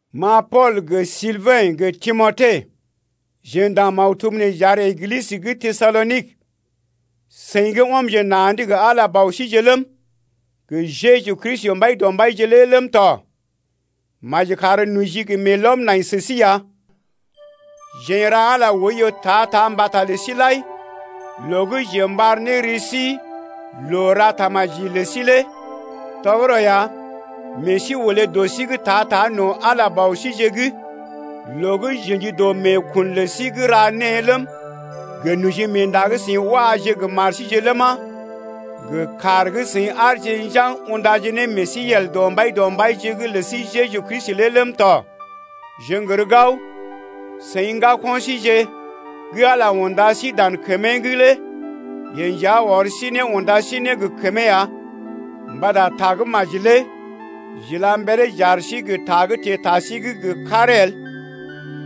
Ma Pool gə Silbɛ̰ gə Timote, jeḛ ndaŋg maktub nee j’ar Eglisə gə́ Tesalonik, seḭ gə́ ɔmje na̰’d gə Ala Bɔ síje ləm, gə Jeju Kristi Mbaidɔmbaije lé ləm tɔ. Maji kar noji gə meelɔm nai sə sí ya! Jeḛ n’ra Ala oiyo ta-ta mbata lə sí lai, loo gə́ jeḛ m’ɓar ne ri sí loo-ra-tamaji lə sí lé. Tɔgərɔ ya, meḛ sí olé dɔ sí’g ta-ta no̰ Ala Bɔ síje’g loo gə́ j’ə̰ji dɔ meekun lə sí gə́ ra née ləm, gə nojimeenda gə́ seḭ waje gə mar síje ləma, gə kaar gə́ seḭ aarje njaŋg undaje ne meḛ sí yel gə́ dɔ Mbaidɔmbaije’g lə sí Jeju Kristi lé ləm tɔ. Jeḛ n’gər gao, seḭ ŋgako̰ síje gə́ Ala unda sí dan kəmee’g lé yeḛ nja ɔr sí ne unda sí ne gə kəmee ya. Mbata tagə́maji lə sí lé j’ila mberee j’ar sí gə ta gə́ teḛ ta sí’g gə karee el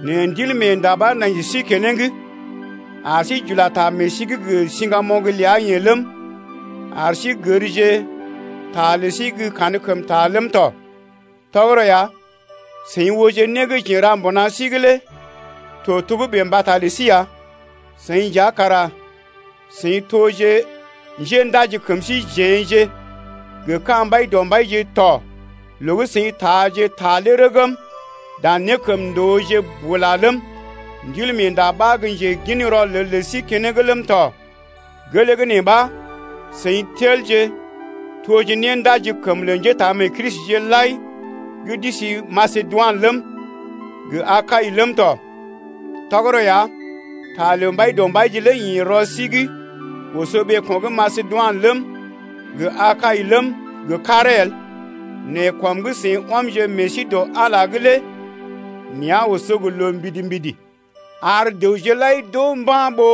nɛ Ndilmeenda ɓa nai sə sí keneŋ ar sí j’ula ta meḛ sí’g gə siŋgamoŋ ləa-yeḛ ləm, ar sí gərje ta lə sí gə́ kankəmta ləm tɔ. Tɔgərɔ ya seḭ ooje né gə́ jeḛ n’ra mbuna sí’g lé to togə́bè mbata lə sí ya. Seḭ nja kara seḭ toje njendaji kəm síjeḛ-je gə ka̰ Mbaidɔmbaije to loo gə́ seḭ taaje ta lé rəgm dan nékəmndooje bula ləm, Ndilmeenda ɓa gə́ njegin rɔlel lə sí keneŋ ləm tɔ. Gelee gə́ nee ɓa, seḭ telje toje néndajikəm lə njétaamee-Kristije lai gə́ d’isi Masedoinə ləm, gə Akai ləm tɔ. Tɔgərɔ ya, ta lə Mbaidɔmbaije lé ḭ rɔ sí’g oso ɓeeko̰ gə́ Masedoinə ləm gə Akai ləm gə karee el nɛ kɔm gə́ seḭ ɔmje meḛ sí dɔ Ala’g lé nea̰ oso gə loo mbidi-mbidi ar dəwje lai d’oo mba̰ ɓó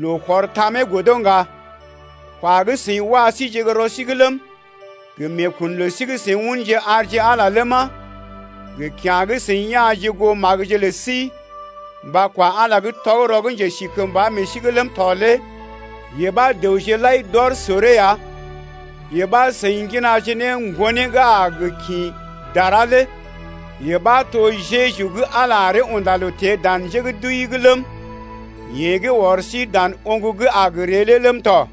loo to̰ tamee godo ŋga. Kwa gə́ seḭ wa síje gə́ rɔ sí’g ləm, gə meekun lə sí gə́ seḭ unje arje Ala ləma, gə kya̰ gə́ seḭ ya̰je goo magəje lə sí mba kwa Ala gə́ tɔgərɔ gə́ njesikəmba meḛ sí’g ləm tɔ lé yee ɓa dəwje lai d’ɔr soree ya. Yee ɓa, seḭ ŋginaje ne Ŋgonee gə́ a gə kḭ dara lé yee ɓa to Jeju gə́ Ala aree unda loo teḛ dan njé gə́ d’wəi’g ləm, yeḛ gə́ ɔr sí dan oŋg gə́ a gə ree lé ləm tɔ.